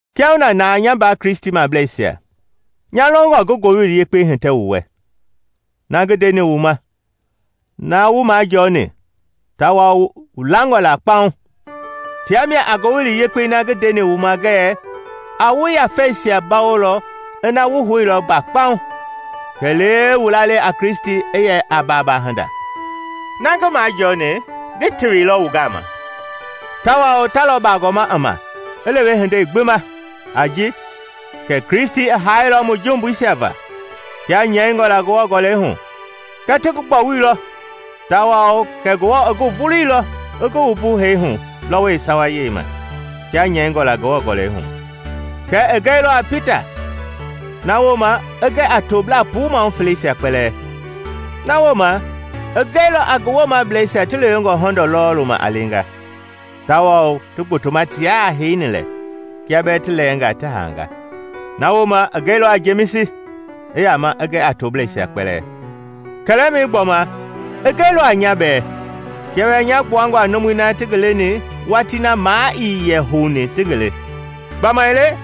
Kiahuna na, nya mbaa Kristimableisia, nya longɔ ngi Ngowili Yekpei hitɛ wu wɛ, na ngi ndeni wu ma, na wu majɔɔni, tawao wu langɔ la kpauŋ. Tia mia a Ngowili Yekpei na ngi ndeni wu ma ngɛɛ a wu yafeisia bawolɔ ina wu houilɔ mba kpaŋ, kɛlee wu lalei a Kristi i yɛ a baaba hinda. Na ngi majɔɔni ngi teweilɔ wu gama, tawao ta lɔ bagɔma i ma i lewe hindei gbi ma, a ji: kɛ Kristi i haailɔ mu jumbuisia va, kia nyɛingɔ la Ngewɔ Gɔlɛi hu; kɛ ti ngi gbɔwuilɔ tawao kɛ Ngewɔ i ngi vuluilɔ i ngi wumbu hee hu lɔwɔi yeesawei ma, kia nyɛingɔ la Ngewɔ Gɔlɛi hu; kɛ i gɛilɔ a Pita, na wooma i gɛ a toblaa puu maahu feleisia kpɛlɛɛ. Na wooma i gɛilɔ a ngi woomablɛisia ti lewengɔ hɔndɔ lɔɔlu ma a leenga, tawao ti gbotoma tiaa heini lɛ, kia bɛɛ ti lɛɛngaa ti haanga. Na wooma i gɛilɔ a Jemisi, i yama i gɛ a toblɛisia kpɛlɛɛ. Kɛlɛmɛi gbɔma, i gɛilɔ a nya bɛɛ, kia bɛɛ nya gbuangɔ a numui na ti ngi leni watii na maa ii houni ti ngi le. Gbamaile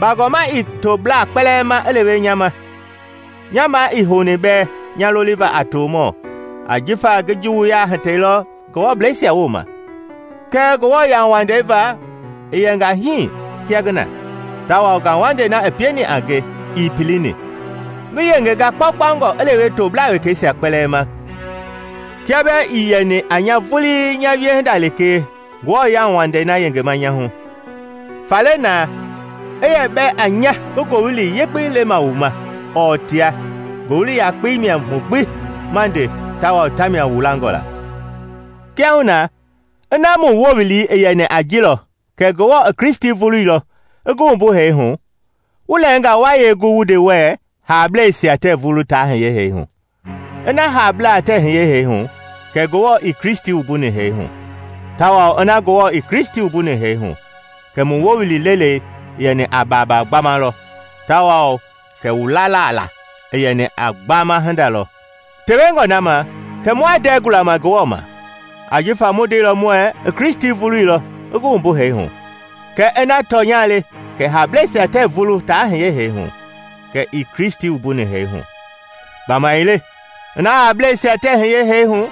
bagɔma i toblaa kpɛlɛɛ ma i lewe nya ma, nya maa ii houni bɛɛ nya loliva a tomɔ ajifa ngi juwuya hitɛilɔ Ngewɔbleisia wooma. Kɛɛ Ngewɔ yauwandei va ngi yɛnga hii kia ngi na, tawao ngauwandei na i pieni a nge ii pilini. Ngi yengenga kpaukpaungɔ i lewe toblaa wekeisia kpɛlɛɛ ma kia bɛɛ ii yeni a nya vulii nya wiehinda kɛlee Ngewɔ yauwandei na yengema nya hu. Faale na, i yɛ a nya ngi Ngowili Yekpei le wu ma ɔɔ tia, Ngowili yakpei mia mu gbi ma nde tawao tamia wu langɔ la. Kiahuna, ina mu wowili i yɛni a ji lɔ kɛ Ngewɔ i Kristi vuluilɔ i ngi wumbu hee hu, wu lɛɛngaa wa yee gu wu nde wuɛɛ haablɛisia tɛɛ vulu taa hiye hee hu? Ina haablaa tɛɛ hiye hee hu, kɛ Ngewɔ ii Kristi wumbuni hee hu, tawao ina Ngewɔ ii Kristi wumbuni hee hu, kɛ mu wowili lelei i yɛni a baaba gbama lɔ tawao kɛ wu lala la i yɛni a gbama hinda lɔ. Tewengɔ na ma, kɛ mua ndɛɛ gulama Ngewɔ ma, ajifa mu ndeilɔ muɛɛ i Kristi vuluilɔ i ngi wumbu hee hu; kɛɛ ina tɔnya le kɛ haablɛisia tɛɛ vulu taa hiye hee hu, kɛ ii Kristi wumbuni hee hu. Gbamaile ina haablɛisia tɛɛ hiye hee hu,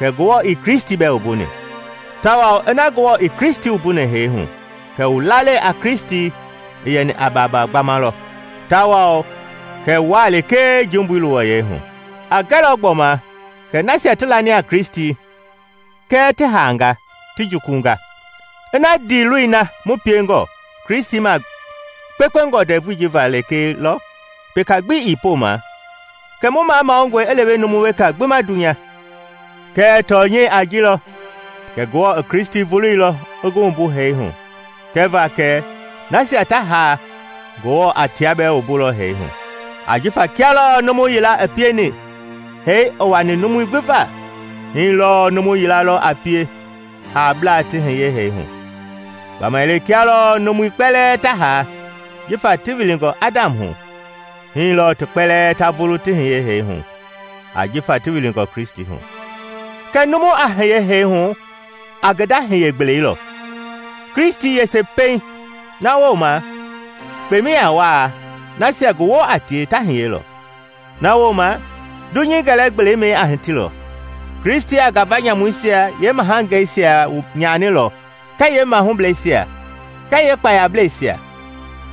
kɛ Ngewɔ ii Kristi bɛɛ wumbuni. Tawao ina Ngewɔ ii Kristi wumbuni hee hu, kɛ wu lalei a Kristi i yɛni a baaba gbama lɔ tawao kɛ wuaa lekee jumbui luwɔyɛi hu. A gɛlɔ gbɔma kɛ nasia ti lani a Kristi kɛɛ ti haanga, ti jukulunga. Ina ndiiloi na mu piengɔ Kristi ma kpekpengɔ ndɛvui ji va lekee lɔ, peka gbi ii poma, kɛ mu mamanungɔe i lewe numu weka gbi ma dunya. Kɛɛ tɔnyɛi a ji lɔ kɛ Ngewɔ i Kristi vuluilɔ i ngi wumbu hee hu kɛva kɛ nasia ta haa Ngewɔ a tia bɛɛ wumbulɔ hee hu. Ajifa kia lɔɔ numu yila i pieni hee i wani numui gbi va, hii lɔɔ numu yila lɔ a pie haablaa ti hiye hee hu. Gbamaile kia lɔɔ numui kpɛlɛɛ ta haa jifa ti wilingɔ Adam hu, hii lɔɔ ti kpɛlɛɛ ta vulu ti hiye hee hu jifa ti wilingɔ Kristi hu. Kɛɛ numu a hiye hee hu a ngi nda hiye-gbelei lɔ, Kristi yese pɛiŋ, na wooma kpemɛi a wa, nasia ngi woo a tie ta hiyelɔ. Na wooma, dunyei gɛlɛ-gbelei a hitilɔ; Kristi a ngafa nyamuisia yeemahangeisia nyanilɔ kɛɛ yeemahublɛisia kɛɛ yeekpayablɛisia,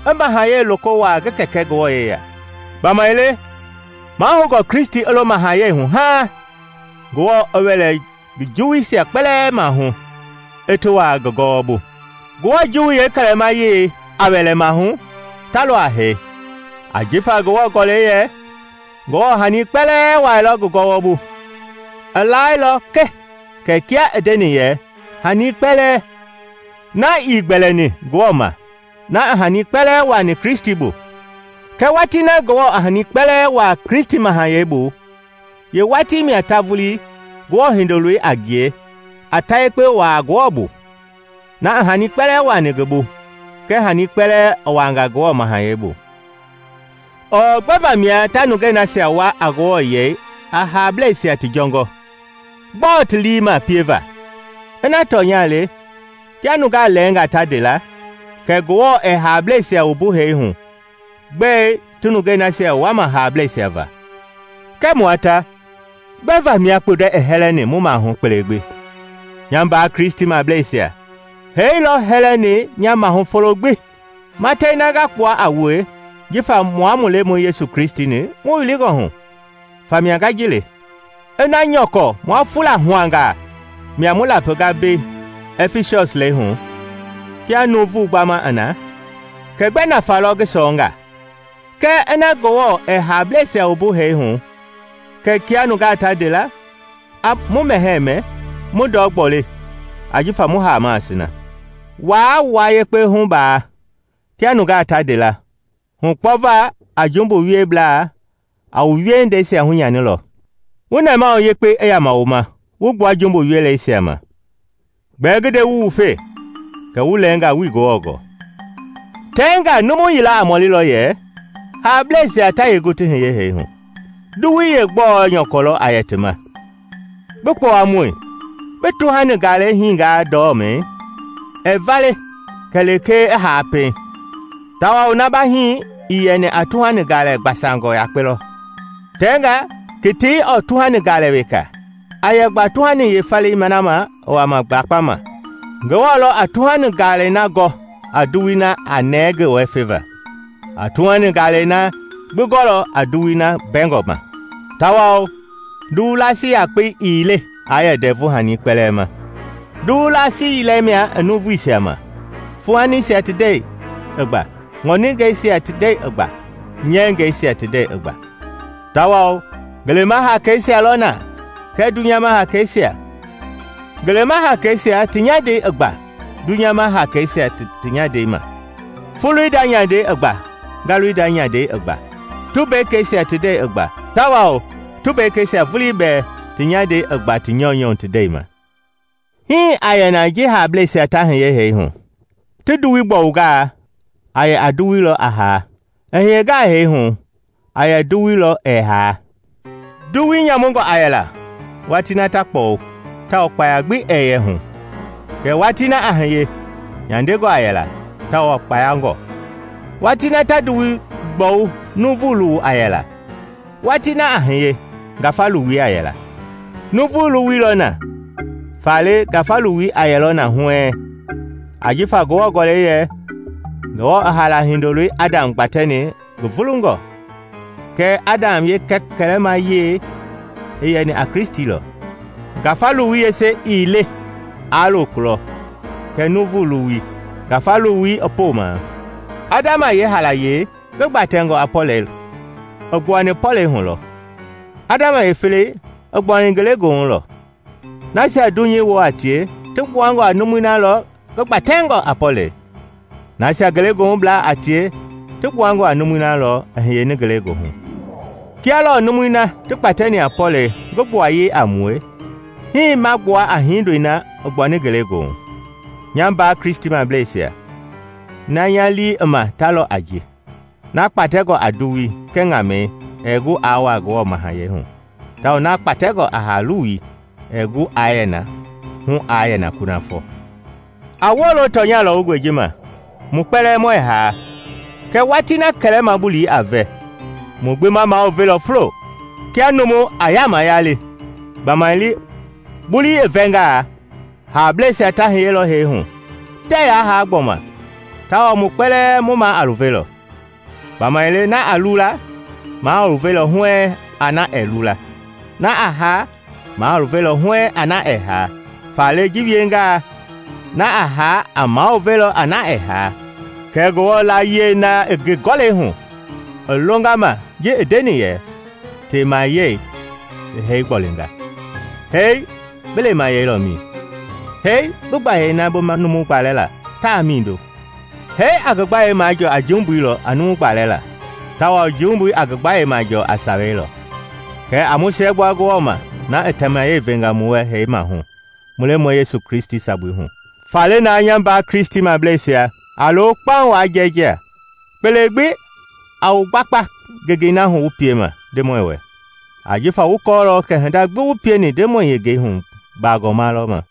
i mahayɛi loko wuaa ngi Kɛkɛ Ngewɔ yeya. Gbamaile mahoungɔ Kristi i lo mahayɛi ma haaŋ Ngewɔ i wɛlɛ juwuisia kpɛlɛɛ maahu, i ti wuaa ngi bu. Ngewɔ juwui yeekɛlɛmayei a wɛlɛ maahu talɔ a hee. Ajifa Ngewɔ Gɔlɛi yɛ, “Ngewɔ i hani kpɛlɛɛ wuaailɔ ngi gɔwɔ bu.” I laailɔ ke kɛ kia i ndeni yɛ “Hani Kpɛlɛɛ,” na ii gbɛlɛni Ngewɔ ma, na i hani kpɛlɛɛ wuaani Kristi bu. Kɛɛ watii na Ngewɔ a hani kpɛlɛɛ wuaa Kristi mahayɛi bu, yeewatii mia ta vulii, Ngewɔ Hindoloi a ngie, a ta yekpe wuaa Ngewɔ bu, na i hani kpɛlɛɛ wuaani ngi bu; kɛ hani kpɛlɛɛ i wuaanga Ngewɔ mahayɛi bu. Ɔɔ gbɛe vamia ta nungei nasia wua a Ngewɔ yei a haablɛisia ti jɔngɔ? Gbɔɔ ti lii i ma pieva? Ina tɔnya le, kia nungaa lɛɛngaa ta nde la, kɛ Ngewɔ ɛɛ haablɛisia wumbu hee hu, gbɛe ti nungei nasia wuama haablɛisia va? Kɛɛ mua ta gbɛe vamia kpundɛ i hɛlɛni mu maahu kpele gbi? Nya mbaa Kristimableisia, hee lɔ hɛlɛni nya maahu folo gbi! Matɛi na nga kpua a wue jifa mua mu Lemɔi Yesu Kristi-ni mu wilingɔ hu, famia nga ji le. Ina nyɔkɔ mua “fulahuangaa” mia mu lapinga mbei Ɛfisɔs lɛi hu kia nuuvu gbama i na, kɛ gbɛ nafa lɔ ngi sɔɔnga? Kɛɛ ina Ngewɔ ɛɛ haablɛisia wumbu hee hu, kɛ kia nungaa ta nde la, “A mu mɛhɛɛ mɛ, mu ndɔ gboli, ajifa mu haamaa sina.” Waa wua yekpe hubaa. Kia nungaa ta nde la, “Hukpɔva a jumbu wieblaa a wu wiehindeisia hunyanilɔ.” Wu nɛmahu yekpei i yama wu ma wu gbua jumbu weleisia ma. Gbɛɛ ngi nde wu wufe kɛ wu lɛɛnga wuii Ngewɔ gɔɔ. Tɛnga numu yila a mɔlilɔ yɛ, “Haablɛisia ta yee gu ti hiye hee hu? Nduwui yeegbɛ nyɔkɔ lɔ a yɛ ti ma?” Bi kpowamɔi! Bi tuhani galei hiingaa ndɔmei, ɛɛ vale kɛlee i haa pɛiŋ. Tawao na ba hii i yɛni a tuhani galɛ gbasangɔ yakpe lɔ, tɛnga ketei ɔɔ tuhani gaalɛ weka, a yɛ gba tuhani yeefalei na ma i wama lakpama. Ngewɔ lɔ a tuhani galei na gɔ a nduwui na a nɛɛ ngi wɛ feva; a tuhani gaalɛ gbi gɔlɔ a nduwui na mbɛngɔ ma. Tawao nduwu laasi yakpei ii le aa yɛ ndɛvu-hani kpɛlɛɛ ma. Nduwu laasi yila mia i nuuvuisia ma, fuuhanisia ti ndɛi i gba, ŋɔningɛisia ti ndɛi i gba, nyɛngɛisia ti ndɛi i gba. Tawao ngelema hakeisia lɔ na kɛɛ dunyama hakeisia; ngelema hakeisia ti nyandei i gba dunyama hakeisia ti nyandei ma. Foloi nda nyandei i gba, ngalui nda nyandei i gba, tumbekeisia ti ndei i gba; tawao tumbekeisia vulii bɛɛ ti nyandei i gba ti nyɔunyɔ ti ndɛi ma. Hii a yɛ na ji haablɛisia ta hiye hee hu. Ti nduwui gbɔwungaa, a yɛ a nduwu lɔ a haa; i hiyengaa hee hu, a yɛ a nduwu lɔ ɛɛ haa. Nduwui nyamungɔ a yɛla watii na ta kpɔwu tawao kpaya gbi ɛɛ yɛ hu; kɛɛ watii na a hiye, nyandengɔ a yɛla, tawao kpayangɔ. Watii na ta nduwui gbɔwu nuuvu luwu a yɛla; watii na a hiye, ngafa luwui a yɛla. Nuuvu luwui lɔ na, faale ngafa luwui a yɛlɔ na huɛɛŋ. Ajifa Ngewɔ Gɔlɛi yɛ, “Ngewɔ i haala hindoi Adam gbatɛni ngi vulungɔ;” kɛɛ Adam yeekɛlɛmayei, i yɛni a Kristi lɔ. Ngafa luwui yese ii le aa loo kulɔ, kɛ nuuvu luwui, ngafa luwui i poma. Adam yeehaalayei, ngi gbatɛngɔ a pɔlɛi, i gbuani pɔlɛi hu lɔ; Adam yeefelei i gbuani ngelegoohu lɔ. Nasia dunyei woo a tie, ti gbuangɔ a numui na lɔ ngi gbatɛngɔ a pɔlɛi; nasia ngelegoohublaa a tie ti gbuangɔ a numui na lɔ i hiyeni ngelegoohu. Kia lɔɔ numui na ti kpatɛni a pɔlɛi ngi gbuayei a mue, hii ma gbua a Hindoi na i gbuani ngelegoohu. Nya mbaa Kristimableisia, na nya lii i ma ta lɔ a ji: na kpatɛngɔ a nduwui kɛɛ ŋamɛi ɛɛ gu aa wuaa Ngewɔ mahayɛi hu, tawao na kpatɛngɔ a haa-luwui ɛɛ gu aa yɛ na hu a yɛna kunafɔ. A wolo tɔnya lɔwungɔi ji ma: mu kpɛlɛɛ muɛ haa, kɛɛ watii na kɛlɛma bulii a vɛ, mu gbi ma maluvelɔ fulo kia numu a yaama yali gbamaile bulii i vɛngaa, haablɛisia ta hiyelɔ hee hu, tɛɛ yaa haa gbɔma, tawao mu kpɛlɛɛ mu maa a luvelɔ. Gbamaile na a lula, maa a luvelɔ huɛɛŋ a na ɛɛ lula; na a haa, maa a luvelɔ huɛɛŋ a na ɛɛ haa. Faale ji wiengaa, na a haa i maluve a na ɛɛ haa, kɛ Ngewɔ layie na i ngi Gɔlɛi hu i longa ma ji i ndeni yɛ, “Temayɛi i hee gbolinga!” “Hee, bi lemayɛi lɔ mi? Hee, bi gbayei na ba numu gbalɛ la taa mindo?” Hee a ngi gbayei majɔɔ a jumbui lɔ a numu gbalɛ la, tawao jumbui a ngi gbayei majɔɔ a Sawei lɔ. Kɛɛ a mu siɛgbua Ngewɔ ma na i temayɛi venga mu wɛ hee maahu mu Lemɔi Yesu Kristi sabui hu! Faale na, nya mbaa Kristimableisia, a lo kpaŋ waa jɛɛjia. Kpele gbi a wu wugbakpa ngengei na hu wu piema Ndemɔi wɛ, ajifa wu kɔɔlɔ kɛ hinda gbi wu pieni Ndemɔi yengei hu bagɔma lɔ ma.